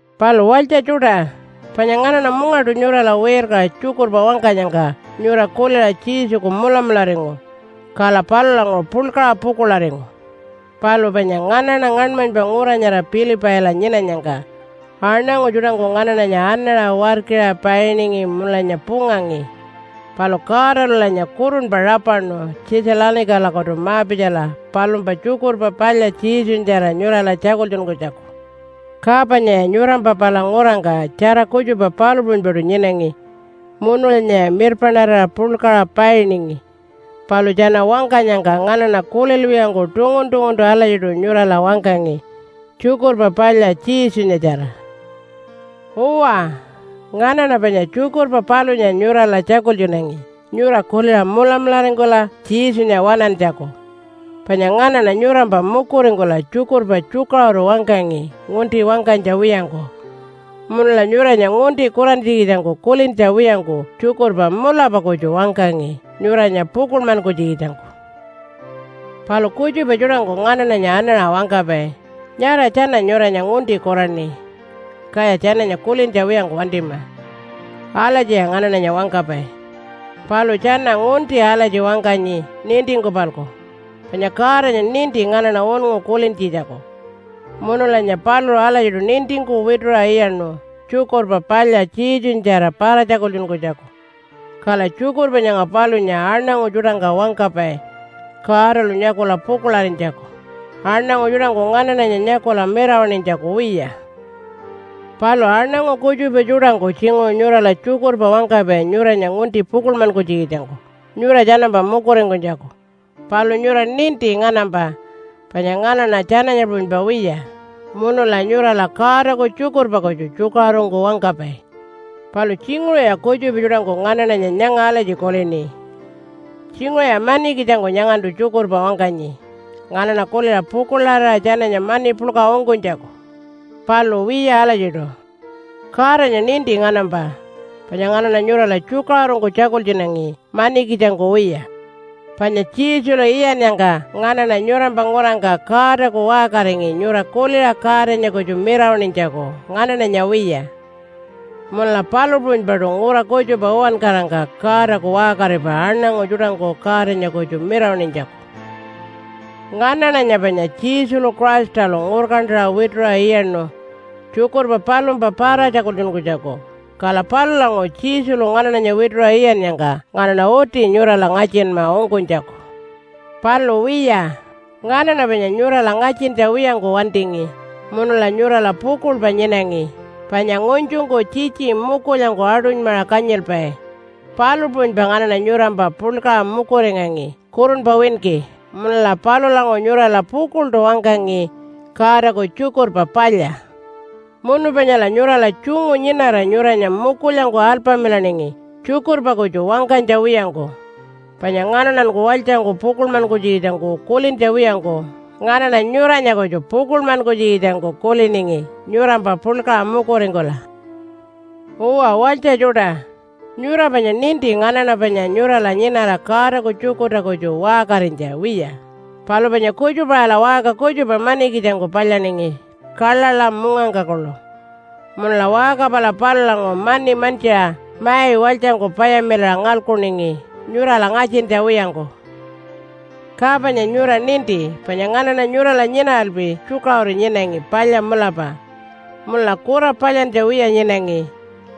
Palu walytja tjuṯa, panya nganaṉa mungaṯu nyurala wirkaṟa tjukurpa wangkanyangka nyura kuliṟa Jesuku mulamularingu, kala palulanguṟu puḻkaṟa pukuḻaringu. Palu panya nganaṉa ngaṉmanypa ngura nyara Pilipaila nyinanyangka aṉangu tjuṯangku nganaṉanya anaṟa warkira painingi munulanya pungangi. Palu Godalulanya kurunpa rapaṉu Tjitja-lanikalakutu ma-pitjala palumpa Tjukurpa Palya Jesunyatjara nyurala tjakultjunkunytjaku. Ka panyaya nyurampa pala ngurangka tjara kutjupa palu puṟunypaṯu nyinangi munulanyaya mirpaṉarira puḻkaṟa painingi. Palu tjana wangkanyangka nganaṉa kulilwiyangku tungun-tunguntu alatjiṯu nyurala wangkangi Tjukurpa Palya Jesunyatjara. Uwa, nganaṉa panya tjukurpa palunya nyurala tjakultjunangi nyura kuliṟa mulamularingkula Jesunya waṉantjaku. Panya nganaṉa nyurampa mukuringkula tjukurpa tjukaṟuru wangkangi ngunti wangkanytja wiyangku. Munula nyuranya ngunti kurantjikitjangku kulintja wiyangku tjukurpa mulapa kutju wangkangi nyuranya pukuḻmankunytjikitjangku. Palu kutjupa tjuṯangku nganaṉanya anaṟa wangkapai, “Nyara tjana nyuranya ngunti kuraṉi, kaya tjananya kulintja wiyangku wantima.” Alatjiya nganaṉanya wangkapai. Palu tjana ngunti alatji wangkanyi nintingku-palku. Panya Godanya ninti nganaṉa unngu kulintjitjaku, munulanya paluṟu alatjiṯu nintingku wituṟa iyaṉu Tjukurpa Palya Jesunyatjara para-tjakultjunkunytjaku. Kala tjukurpa nyanga palunya aṉangu tjuṯangka wangkapai Godalu nyakula pukuḻarinytjaku, aṉangu tjuṯangku nganaṉanya nyakula mirawaṉinytjaku wiya. Palu aṉangu kutjupa tjuṯangku tjinguṟu nyurala tjukurpa wangkapai nyuranya ngunti pukuḻmankunytjikitjangku nyura tjanampa mukuringkunytjaku. Palu nyura ninti nganampa panya nganaṉa tjananya puṟunypa wiya, munula nyurala Godaku tjukurpa kutju tjukaṟurungku wangkapai. Palu tjinguṟuya kutjupa tjuṯangku nganaṉanya nyanga alatji kulini, “Tjinguṟuya manikitjangku nyangantu tjukurpa wangkanyi nganaṉa kuliṟa pukuḻarira tjananya mani puḻka ungkunytjaku.” Palu wiya alatjiṯu. Godanya ninti nganampa panya nganaṉa nyurala tjukaṟurungku tjakultjunangi manikitjangku wiya. Panya Jesulu iyannyangka nganaṉa nyurampa ngurangka Godaku waṟkaringi nyura kuliṟa Godanya kutju mirawaṉinytjaku nganaṉanya wiya. Munula palu puṟunypaṯu ngura kutjupa uwankarangka Godaku waṟkaripai aṉangu tjuṯangku Godanya kutju mirawaṉinytjaku. Nganaṉanya panya Jesulu Christalu ngurkantaṟa wituṟa iyaṉu tjukurpa palumpa para-tjakultjunkunytjaku. Kala palulanguṟu Jesulu nganaṉanya wituṟa iyannyangka nganaṉa uti nyurala ngatjinma ungkunytjaku. Palu wiya, nganaṉa panya nyurala ngatjintja wiyangku wantingi munula nyurala pukuḻpa nyinangi, panya ngunytjungku tjitji mukulyangku aṯunymaṟa kanyilpai, palu puṟunypa nganaṉa nyurampa puḻkaṟa mukuringangi kurunpa winki. Munula palulanguṟu nyurala pukuḻṯu wangkangi Godaku Tjukurpa Palya. Munu panyala nyurala tjungu nyinara nyuranya mukulyangku alpamilaningi tjukurpa kutju wangkanytja wiyangku. Panya nganaṉanku walytjangku pukuḻmankunytjikitjangku kulintja wiyangku nganaṉa nyuranya kutju pukuḻmankunytjikitjangku kuliningi nyurampa puḻkaṟa mukuringkula. Uwa walytja tjuṯa, nyura panya ninti nganaṉa panya nyurala nyinara Godaku tjukurta kutju waṟkarinytja wiya, palu panya kutjupa-aṟala waṟka kutjupa manikitjangku palyaningi kaḻaḻa mungangka kuḻu. Munula waṟka pala palulanguṟu mani mantjiṟa mai walytjangku payamilaṟa ngalkuningi nyurala ngatjintja wiyangku. Ka panya nyura ninti panya nganaṉa nyurala nyinaralpi tjukaṟuru nyinangi palya mulapa, munula kura palyantja wiya nyinangi,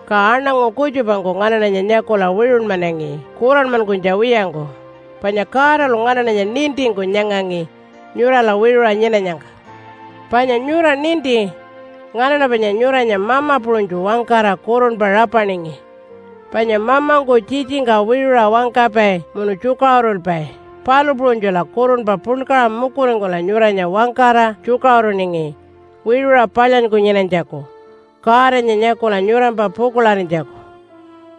ka aṉangu kutjupangku nganaṉanya nyakula wiṟunmanangi kuranmankunytja wiyangku. Panya Godalu nganaṉanya nintingku nyangangi nyurala wiṟuṟa nyinanyangka. Panya nyura ninti nganaṉa panya nyuranya mama puṟunytju wangkara kurunpa rapaningi, panya mamangku tjitjingka wiṟuṟa wangkapai munu tjukaṟurulpai, palu puṟunytjula kurunpa puḻkaṟa mukuringkula nyuranya wangkara tjukaṟuruningi wiṟuṟa palyanyku nyinanytjaku Godanya nyakula nyurampa pukuḻarinytjaku.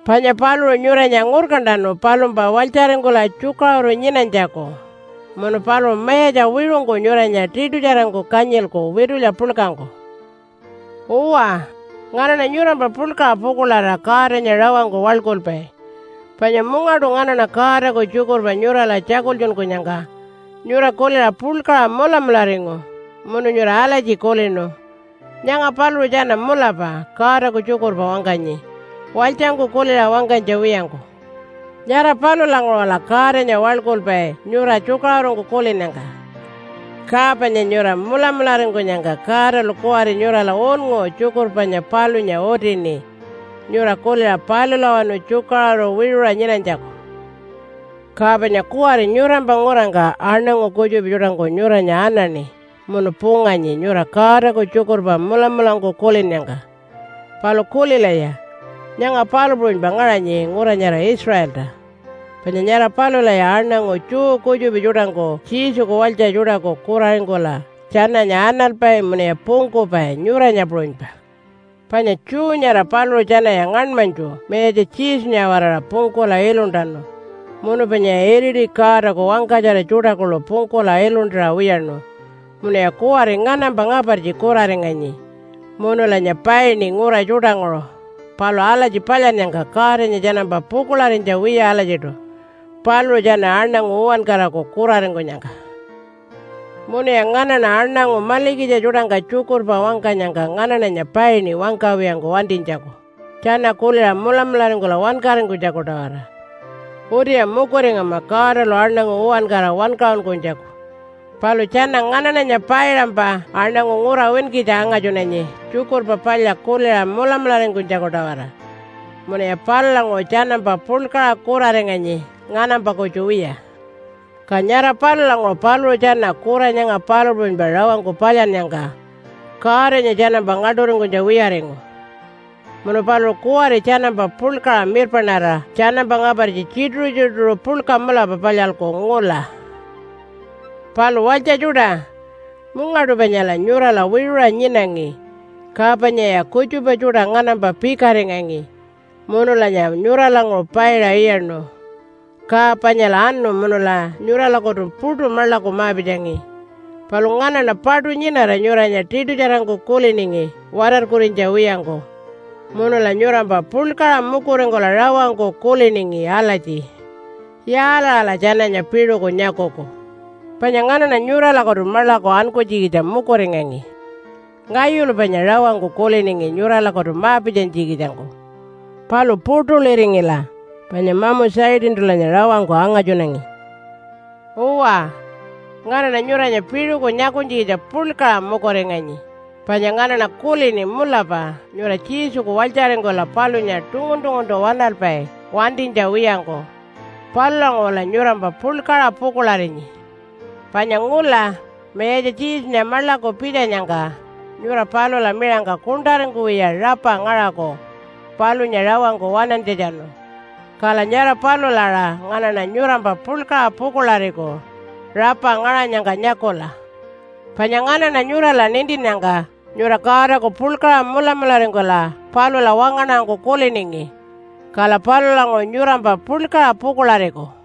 Panya paluṟu nyuranya ngurkantanu palumpa walytjaringkula tjukaṟuru nyinanytjaku, munu paluṟu Mayatja wiṟungku nyuranya tiṯutjarangku kanyilku witulya puḻkangku. Uwa, nganaṉa nyurampa puḻkaṟa pukuḻarira Godanya rawangku waḻkulpai, panya mungaṯu nganaṉa Godaku tjukurpa nyurala tjakultjunkunyangka nyura kuliṟa puḻkaṟa mulamularingu munu nyura alatji kulinu, “Nyanga paluṟu tjana mulapa Godaku tjukurpa wangkanyi, walytjangku kuliṟa wangkanytja wiyangku.” Nyara palulanguṟula Godanya waḻkulpai nyura tjukaṟurungku kulinnyangka. Ka panya nyura mulamularingkunyangka Godalu kuwari nyurala unngu tjukurpa panya palunya utini nyura kuliṟa palulawanu tjukaṟuru wiṟuṟa nyinanytjaku. Ka panya kuwari nyurampa ngurangka aṉangu kutjupa tjuṯangku nyuranya anaṉi munu punganyi nyura Godaku tjukurpa mulamulangku kulinnyangka. Palu kulilaya, nyanga palu puṟunypa ngaṟanyi ngura nyara Israelta, panya nyara palulaya aṉangu Jew kutjupa tjuṯangku Jesuku walytja tjuṯaku kuraringkula tjananya analpai munuya pungkupai nyuranya puṟunypa. Panya Jew nyara paluṟu tjanaya ngaṉmanytju Mayatja Jesunya-waraṟa pungkula iluntanu munu panyaya iriti Godaku wangkatjara tjuṯa kuḻu pungkula iluntaṟa wiyaṉu. Munuya kuwari nganampa ngapartji kuraringanyi munulanya paini ngura tjuṯanguṟu. Palu alatji palyannyangka Godanya tjanampa pukuḻarinytja wiya alatjiṯu paluṟu tjana aṉangu uwankaraku kuraringkunyangka. Munuya nganaṉa aṉangu malikitja tjuṯangka tjukurpa wangkanyangka nganaṉanya paini wangkawiyangku wantinytjaku, tjana kuliṟa mulamularingkula wankaringkunytjaku-tawara. Utiya mukuringama Godalu aṉangu uwankara wankaṟunkunytjaku, palu tjana nganaṉanya paiṟampa aṉangu ngura winkitja angatjunanyi Tjukurpa Palya kuliṟa mulamularingkunytjaku-tawara munuya palulanguṟu tjanampa puḻkaṟa kuraringanyi nganampa kutju wiya. Ka nyara palulanguṟu paluṟu tjana kura nyanga palu puṟunypa rawangku palyannyangka Godanya tjanampa ngaḻṯuringkunytja wiyaringu. Munu paluṟu kuwari tjanampa puḻkaṟa mirpaṉarira tjanampa ngapartji tjituṟu-tjituṟu puḻka mulapa palyalku ngula. Palu walytja tjuṯa, mungaṯu panyala nyurala wiṟuṟa nyinangi, ka panyaya kutjupa tjuṯa nganampa pikaringangi munulanya nyuralanguṟu paiṟa iyaṉu. Ka panyala anu munula nyuralakutu puṯu maḻaku ma-pitjangi. Palu nganaṉa paṯu nyinara nyuranya tiṯutjarangku kuliningi watarkurinytja wiyangku, munula nyurampa puḻkaṟa mukuringkula rawangku kuliningi alatji, “Yaalaṟala tjananya piṟuku nyakuku?” Panya nganaṉa nyuralakutu maḻaku ankunytjikitja mukuringangi. Ngayulu panya rawangku kuliningi nyuralakutu ma-pitjanytjikitjangku. Palu puṯuliringila, panya mamu Satantulanya rawangku angatjunangi. Uwa, nganaṉa nyuranya piṟuku nyakunytjikitja puḻkaṟa mukuringanyi, panya nganaṉa kulini mulapa nyura Jesuku walytjaringkula palunya tungun-tunguntu waṉalpai wantinytja wiyangku. Palulanguṟula nyurampa puḻkaṟa pukuḻarinyi. Panya ngula Mayatja Jesunya maḻaku pitjanyangka nyura palula miṟangka kuṉṯaringkuwiya rapa ngaṟaku palunya rawangku waṉantjatjanu. Kala nyara palula aṟa nganaṉa nyurampa puḻkaṟa pukuḻariku rapa ngaṟanyangka nyakula. Panya nganaṉa nyurala nintinnyangka nyura Godaku puḻkaṟa mulamularingkula palula wangaṉarangku kuliningi. Kala palulanguṟu nyurampa puḻkaṟa pukuḻariku.